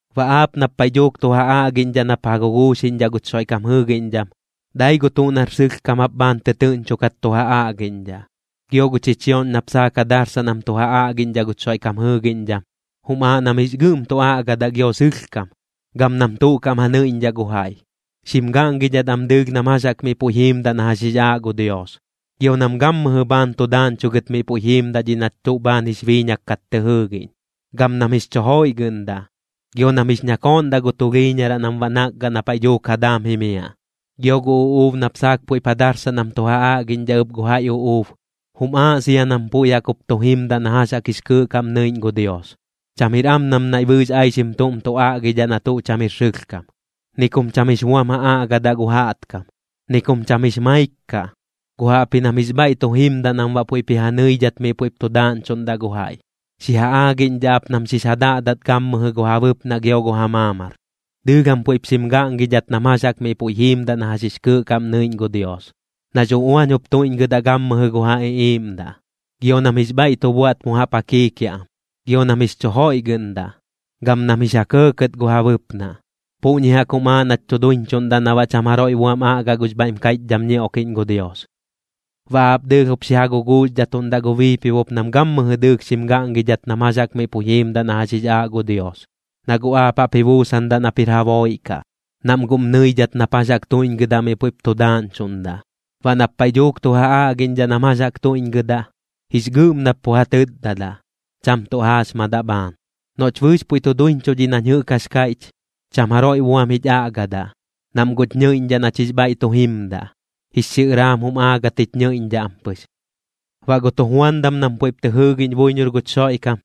Baꞌ aap nap paiꞌ dhuuk tu ja aꞌgiꞌñdhaꞌ nap ja guguuxdhaꞌ guch Xoiꞌkam jɨɨgiꞌñdham, dai gu tuꞌ nar sɨlhkam jap bhaan tɨtɨɨꞌñchokat tu ja aꞌgiꞌñdhaꞌ. Gio gu chichioꞌñ nap saak ja darsaꞌ nam tu ja aꞌgiꞌñdhaꞌ guch Xoiꞌkam jɨɨgiꞌñdham, jum aaꞌ nam jix gɨꞌm tu aꞌgadaꞌ gio sɨlhkam, gam nam tuꞌ kaꞌm ja nɨiꞌñdhaꞌ gu jaiꞌ. Xim gaꞌngidhat am dɨɨlh nam jax jaꞌk miꞌ puiꞌ jiimdaꞌ na jax jix aaꞌ gu Dios, gio nam gammɨjɨ bhaan tu daaꞌñchugɨt miꞌ puiꞌ jiimdaꞌ dhiꞌ nach tuꞌ bhaan jix biiñak kat tɨ jɨɨgiꞌñ. Gam nam jix chu joiꞌgɨꞌndaꞌ, gio nam jix ñakooꞌndaꞌ gu tulhiiñaraꞌ nam baꞌ nakgaꞌ na paiꞌ dhuuk ja daam ji jimiaꞌ. Gio gu uꞌuub nap saak puiꞌp ja darsaꞌ nam tu ja aꞌgiꞌñdhaꞌ ɨp gu jaiꞌ uꞌuub, jum aaꞌ sia nam puiꞌ jaꞌk jup tu jimdaꞌ na jax jix kɨɨꞌ kaꞌm nɨiꞌñ gu Dios. Cham jir am nam naiꞌ bɨɨx aixim tuꞌm tu aꞌgidhaꞌ na tuꞌ cham jir sɨlhkam, ni kum cham jix buam ja aꞌgadaꞌ gu jaꞌtkam, ni kum cham jix maik kaꞌ. Guꞌ jaꞌpji nam jix bhaiꞌ tu jimdaꞌ nam baꞌ puiꞌp ji ja nɨidhat miꞌ puiꞌp tu daaꞌñchuꞌndaꞌ gu jaiꞌ. Xi ja aagiꞌñdhaꞌ ap nam xix ja daꞌdat gammɨjɨ gu ja bɨpnaꞌ gio gu ja maamar. Dɨɨlh jam puiꞌp xim gaꞌngidhat nam jax jaꞌk miꞌ puiꞌ jiimdaꞌ na jax jix kɨɨꞌ kaꞌm nɨiꞌñ gu Dios, nax uꞌuañ jup tuiꞌñgɨdaꞌ gammɨjɨ gu ja iꞌiiꞌmdaꞌ. Gio nam jix bhaiꞌ tu buaꞌt mu jaꞌp ja kiikiaꞌ am, gio nam jix chu joiꞌgɨꞌndaꞌ, gam nam jix ja kɇɇkɇt gu ja bɨpnaꞌ. Puꞌñi jaꞌk jum aaꞌ nach tu duiñchuꞌndaꞌ na baꞌ cham jaroiꞌ buam aꞌgaꞌ gux bhaiꞌm kaiꞌchdham ñioꞌkiꞌñ gu Dios. Baꞌ aap dɨɨlh jup xi ja guguuxdhatuꞌndaꞌ gu biipibop nam gammɨjɨ dɨɨlh xim gaꞌngidhat nam jax jaꞌk miꞌ puiꞌ jiimdaꞌ na jax jix aaꞌ gu Dios. Na guꞌ aap jaꞌp ji buusandaꞌ nap jir ja booiꞌ kaꞌ, nam guꞌm nɨidhat nap jax jaꞌk tuiꞌñgɨdaꞌ miꞌ puiꞌp tu daaꞌñchuꞌndaꞌ. Baꞌ nap paiꞌ dhuuk tu ja aꞌgiꞌñdhaꞌ nam jax jaꞌk tuiꞌñgɨdaꞌ, jix gɨꞌm nap pu ja tɨtdadaꞌ, cham tuꞌ jaaxmadaꞌ bhaan. Noꞌch bɨɨx puiꞌ tu duiñchuꞌ dhiꞌ nañ jɨꞌk jax kaiꞌch, cham jaroiꞌ buam jich aꞌgadaꞌ, nam guꞌch nɨiꞌñdhaꞌ nach jix bhaiꞌ tu jimdaꞌ, jix xiꞌɨraam jum aagat jich ñɨiꞌñdhaꞌ am pɨx. Baꞌ gu tujuandam nam puiꞌp tɨ jɨɨgiꞌñ buiñor guch Xoiꞌkam,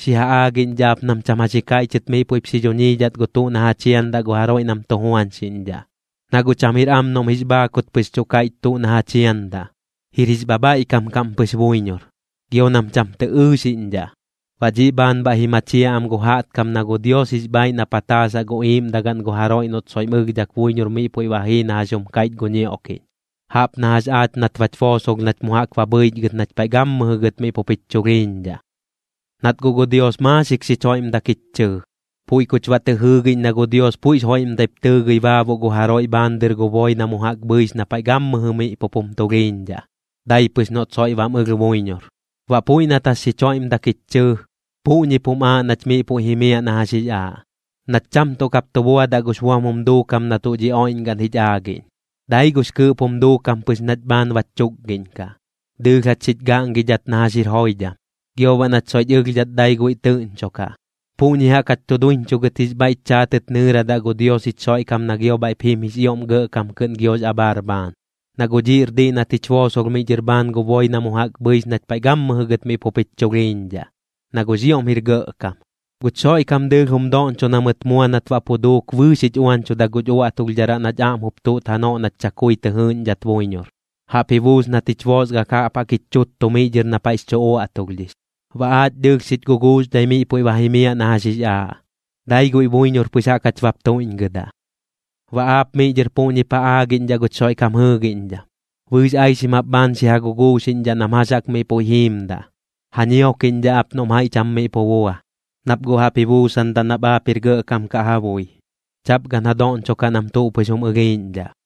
xi ja aagiꞌñdhaꞌ ap nam cham jax ji kaiꞌchɨt miꞌ puiꞌp xi dhuñiidhat gu tuꞌ na ja chiandaꞌ gu jaroiꞌ nam tu juañxiꞌñdhaꞌ. Na guꞌ cham jir am noꞌm jix bhaakut pɨx tuꞌ kaiꞌch tuꞌ na ja chiandaꞌ, jir jix bhabhaiꞌkam kaꞌm pɨx buiñor. Gio nam cham tɨ ɨɨxiꞌñdhaꞌ, baꞌ dhiꞌ bhaan bhaiꞌ ji machiaꞌ am gu jaꞌtkam na gu Dios jix bhaaiꞌ na pataasaꞌ gu iiꞌmdagaꞌn gu jaroiꞌ noꞌt soiꞌm ɨlhdhak buiñor miꞌ puiꞌ ba jii na jax jum kaiꞌch gu ñioꞌkiꞌñ, jaꞌp na jax aach nat bach boosolh nach mu jaꞌk ba bhɨichgɨt nach paiꞌ gammɨjɨ gɨt miꞌ pup jich chulhiiñdhaꞌ. Nat guꞌ gu Dios maaxik xich joiꞌmdak jich chɨɨ, puiꞌ kuch baꞌ tɨ jɨɨgiꞌñ na gu Dios puiꞌx joiꞌmdaip tɨɨgɨi baabuꞌ gu jaroiꞌ bhaan dɨr gu boi na mu jaꞌk bhɨix na paiꞌ gammɨjɨ miꞌ pup jum tulhiiñdhaꞌ, dai pɨx noꞌt soiꞌ bam ɨlh buiñor. Baꞌ puiꞌ nat jax xich joiꞌmdak jich chɨɨ, puꞌñip jum aaꞌ nach miꞌ puiꞌ jimiaꞌ na jax jix aaꞌ, nach cham tuꞌ kap tu buadaꞌ gux buam jum duukam na tuꞌ dhi oiꞌñgaꞌn jich aagiꞌñ, dai gux kɨɨꞌp jum duukam pɨx nach bhaan bach chukgiꞌñkaꞌ. Dɨɨlh jach xich gaꞌngidhat na jax jir joidham, gio baꞌ nach soiꞌch ɨlhdhat dai guiꞌ tɨꞌñchokaꞌ. Puꞌñi jaꞌk jach tu duiñchugɨt jix bhaiꞌch chaatɨt nɨɨradaꞌ gu Dios jich Xoiꞌkam na gio bhaiꞌp jim jix ioꞌm gɇꞌkam kɨꞌn giox abhaar bhaan. Na guꞌ dhiꞌr diꞌ nat jich boosolh miꞌ dhɨr bhaan gu boi na mu jaꞌk bhɨix nach paiꞌ gammɨjɨ gɨt miꞌ pup jich chulhiiñdhaꞌ, na guꞌx ioꞌm jir gɇꞌkam. Guch Xoiꞌkam dɨɨlh jum doꞌñcho na mɨt mua nat baꞌ pu duuk bɨɨx jich uañchuda guch uaꞌtulhdharaꞌ nach aꞌm jup tuꞌt janoꞌ nach chakui tɨ jɨɨꞌñdhat buiñor, jaꞌp ji buus nat jich boosgak jaꞌp jaꞌk jich chuttu miꞌ dhɨr na paiꞌx chu uaꞌtulhdhix. Baꞌ aach dɨɨlh xich guguuxdhai miꞌ puiꞌ ba jimiaꞌ na jax jix aaꞌ, dai guiꞌ buiñor pɨx jaꞌk jach bap tuiꞌñgɨdaꞌ. Baꞌ aap miꞌ dhɨr puꞌñip ja aagiꞌñdhaꞌ guch Xoiꞌkam jɨɨgiꞌñdham, bɨɨx aixim jap bhaan xi ja guguuxiꞌñdhaꞌ nam jax jaꞌk miꞌ puiꞌ jiimdaꞌ. Ja ñiokiꞌñdhaꞌ ap noꞌm jaiꞌ cham miꞌ pu bua, nap guꞌ jaꞌp ji buusandaꞌ nap aap jir gɇꞌkam kaꞌ ja bui. Chaꞌp gan ja doꞌñchokaꞌ nam tuꞌ pɨx jum ɨlhiiꞌñdhaꞌ.